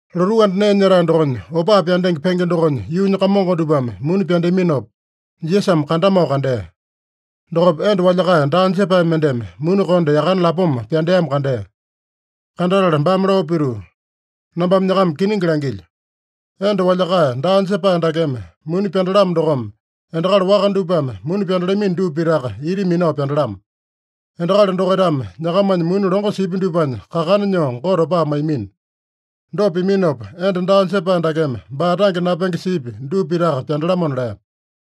Lotuu anda nee nyetae dokonya opaa pyandenge penge dokonya yuunya kamongo dupame muni pyandeaminopa, Jisasame kandamao kandea. Dokopa enda walyakae daa jepae mendeme muni konde yakane lapoma pyandeamo kandea. Kandatala baame lao pituu, “Nambame nyakama kiningi langilyo: Enda walyakae daa jepae dakeme muni pyandalamo dokome, endakali waka dupame muni pyandalamino dupa pitaka ita minao pyandalamo. Endakali dokaitame nyakamanya muni longo sipya dupanya kakana nyoo Gote opaa maiyamino. Dopa piminopa, enda daa jepae dakeme baa tange napenge sipya dupa pitaka pyandalamona” lea.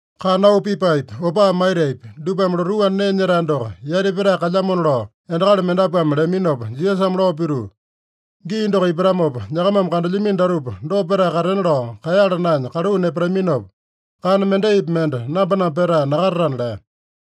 Kana auu pipaepi, opaa maitaepi, dupame lotuu anda nee nyetae doko yati petae kalyamona lao endakali mendapuame leaminopa, Jisasame lao pituu, “Gii doko ipatamopa, nyakamame kandelyamino datupa dopa petae katena lao kaeyala naenya kaluu nepataminopa, kana mendaipi mende namba-namba petae nakatatana” lea.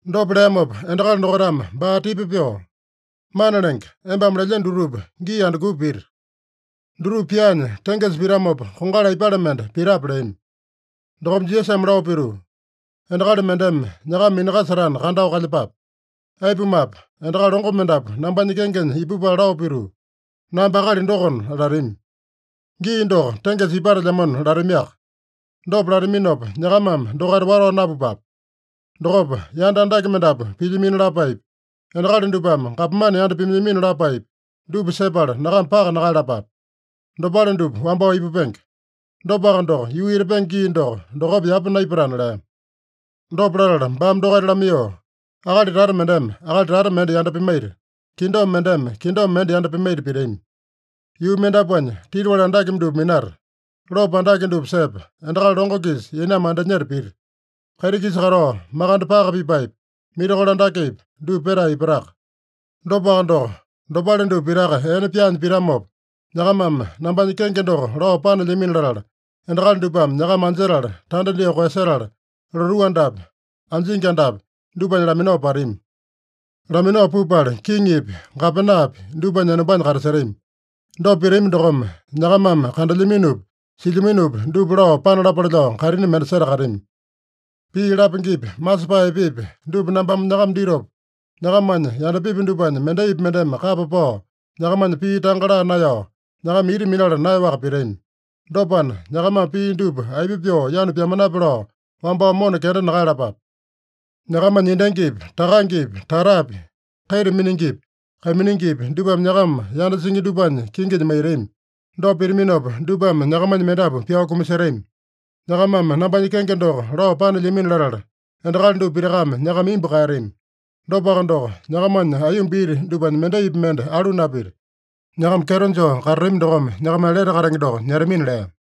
Dopa leamopa endakali dokaitame baa tipa pyoo, “Mana Lenge, embame lelyeno dutupa gii andukupa pita? Dutupa pyaanya tengesa pitamopa, kongali aipale mende pitape?” leami. Dokopa Jisasame lao pituu, “Endakali mendeme nyakama minakasetana, kandao kalyepape. Aipumape, endakali longo mendapu nambanya kengenya ipupala lao pituu, ‘Namba akali dokona’ latami. ‘Gii doko tengesa ipatelyamona’ latamiaka. Dopa lataminopa, nyakamame dokaita watao napupape. Dokopa yanda andake mendapu pilyamino lapaepi, endakali dupame gapomane yanda pimailyamino lapaepi, dupa sepala nyakama paka nakaeyalapape. Dopale dupa wambao ipupenge. Dopaka doko, yuu etapenge gii doko, dokopa yapa naipatana” lea. Dopa latala baame dokaita lamaiyoo, “Akali tata mendeme akali tata mende yanda pimaita, kingdom mendeme kingdom mende yanda pimaita pitami. Yuu mendapuanya titiwali andake dupa minata, lopo andake dupa sepa, endakali longo-kisa yainame andinyeta pita. Kaiti-kisa katao makande paka pipaepi, mirakolo andakepi, dupa petae ipataka. Dopaka doko, dopale dupa pitaka ene pyaanya pitamopa, nyakamame nambanya kenge doko lao panelyamino latala, endakali dupame nyakama anjetala, tanda dyoo koeyasetala, lotuu andapi, anjingi andapi dupanya laminao patami. Laminao pupala, kiŋipi, gapenapi dupanya enombanya katasetami. Dopa pitami dokome, nyakamame kandelyaminopi, silyaminopi dupa lao panalapale lao kaitini mende setakatami. Pii lapengepi, masepae epepi, dupa nambame nyakama ditopa, nyakamanya yandapipi dupanya mendaipi mendeme kapa pao nyakamanya pii tanga laa naeyao, nyakama ita minala naeyaowaka pitami. Dopana, nyakamame pii dupa aipa pyoo yanu pyamanape lao wambao mona kenda nakaeyalapape. Nyakamanya endangipi, takangepi, tatapi, kaita miningipi, kaiminingipi dupame nyakama yanda singi dupanya kinginya maitami. Dopa pitaminopa, dupame nyakamanya mendapu pyao kumasetami. Nyakamame nambanya kenge doko lao panelyamino latala, endakali dupa pitakame nyakama imbu kaeyatami. Dopaka doko, nyakamanya aiyomba iti dupanya mendaipi mende alu napita. Nyakama kyeto joo katatami dokome, nyakamanya lete katenge doko nyetamina” lea.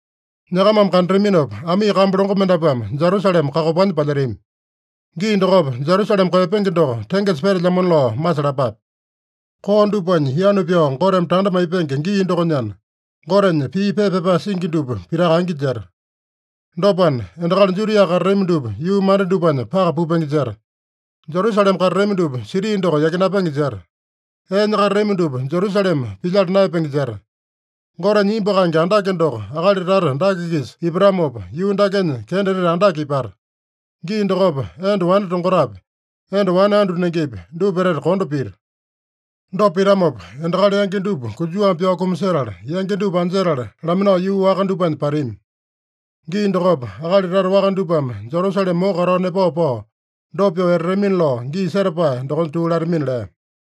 “Nyakamame kandataminopa, amii kambu longo mendapuame Jerusalema kakopanya palyetami. Gii dokopa, Jerusalema koeyapenge doko tengesa petelyamona lao masalapape. Koo dupanya yanu pyao Goteme tanda maipenge gii dokonyana, Gotenya pii pepa pyapae singi dupa pitaka angi jeta. Dopana, endakali Judia katatami dupa yuu manda dupanya paka pupenge jeta. Jerusalema katatami dupa siti doko yakinapenge jeta. Eenya katatami dupa Jerusalema pilyala naeyapenge jeta. Gotenya imbu kaenge andake doko akali tata dake-kisa ipatamopa, yuu dakenya kenda etete andake ipata. Gii dokopa enda wane tongotapi, enda wane andu nengepi, dupa etete kondo pita. Dopa pitamopa, endakali yangi dupa konjuwame pyao kumasetala, yangi dupa anjetala laminao yuu waka dupanya patami. Gii dokopa, akali tata waka dupame Jerusalema moko katao nepao pao, dopa pyoo etatamina lao gii setapae dokonya tuu latamina” lea.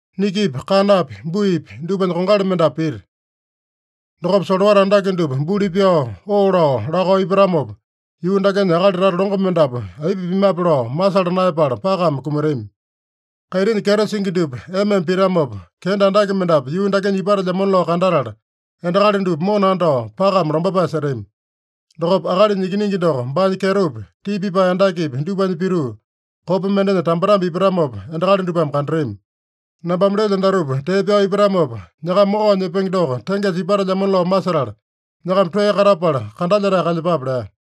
“Nikipi, kanapi, buipi dupanya kongali mendapu pita. Dokopa solowata andake dupa buli pyao, oo lao, lakao ipatamopa, yuu dakenya akali tata longo mendapu aipa pimape lao masala naeyapala pakame kumatami. Kaitinya kyeto singi dupa ema-ema pitamopa, kenda andake mendapu yuu dakenya ipatelyamona lao kandatala, endakali dupa mona andao, pakame lombapae setami. Dokopa Akalinya Ikiningi doko baanya kyetopi, tii pipae andakepi dupanya pituu, kopa mendenya tambetambe ipatamopa endakali dupame kandatami. Nambame lelyo datupa tee pyao ipatamopa, nyakama mokao nyepenge doko tengesa ipatelyamona lao masetala, nyakama toeya katapala kandalyetae kalyepape” lea.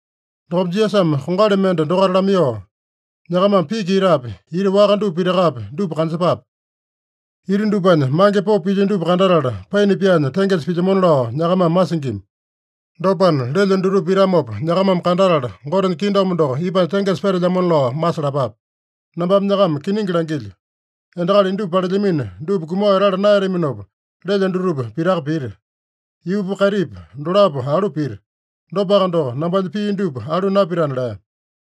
Dokopa Jisasame kongali mende dokaita lamaiyoo, “Nyakamame piki itapi, ita waka dupa pitakapi, dupa kanjepape. Ita dupanya mange popo pilya dupa kandatala, paina pyaanya tengesa pilyamona lao nyakamame masingima. Dopana, lelyo dutupa pitamopa nyakamame kandatala, Gotenya kingdom doko ipanya tengesa petelyamona lao masalapape. Nambame nyakama kiningi langilyo: Endakali indupa palelyamino dupa kumao etala naeyataminopa, lelyo dutupa pitaka pita. Yuupa kaitipa dolapo alu pita. Dopaka doko, nambanya pii dupa alu napitana” lea.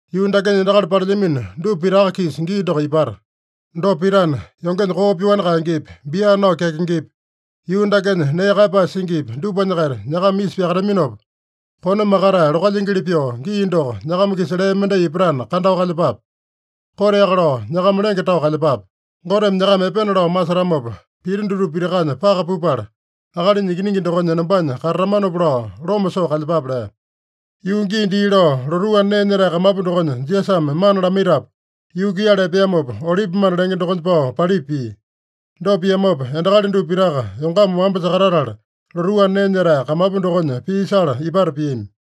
“Yuu dakenya endakali palelyamino dupa pitaka-kisa gii doko ipata. Dopa pitana, yongenya koo pyoani kaengepi, bia nao kyakengepi, yuu dakenya nee kaeyapae singipi, dupanya-kaita nyakama isa pyakataminopa, kone makatae lokalyingili pyoo, gii doko nyakama-kisa lee mendai ipatana, kandao kalyepape. Koteaka lao nyakama lenge tao kalyepape. Goteme nyakama epena lao masetamopa, pita dutupa pitakanya paka pupala, Akalinya Ikiningi dokonya enombanya katatamanopa lao loma soo kalyepape” lea. Yuu gii dii lao, lotuu anda nee nyetae kamapu dokonya Jisasame mana lamaitapu, yuu kuiyala epeamopa, Olipimanda lenge dokonya pao palipa pia. Dopa piamopa, endakali dupa pitaka yongama wamba sakatatala, lotuu anda nee nyetae kamapu dokonya pii sala ipata piami.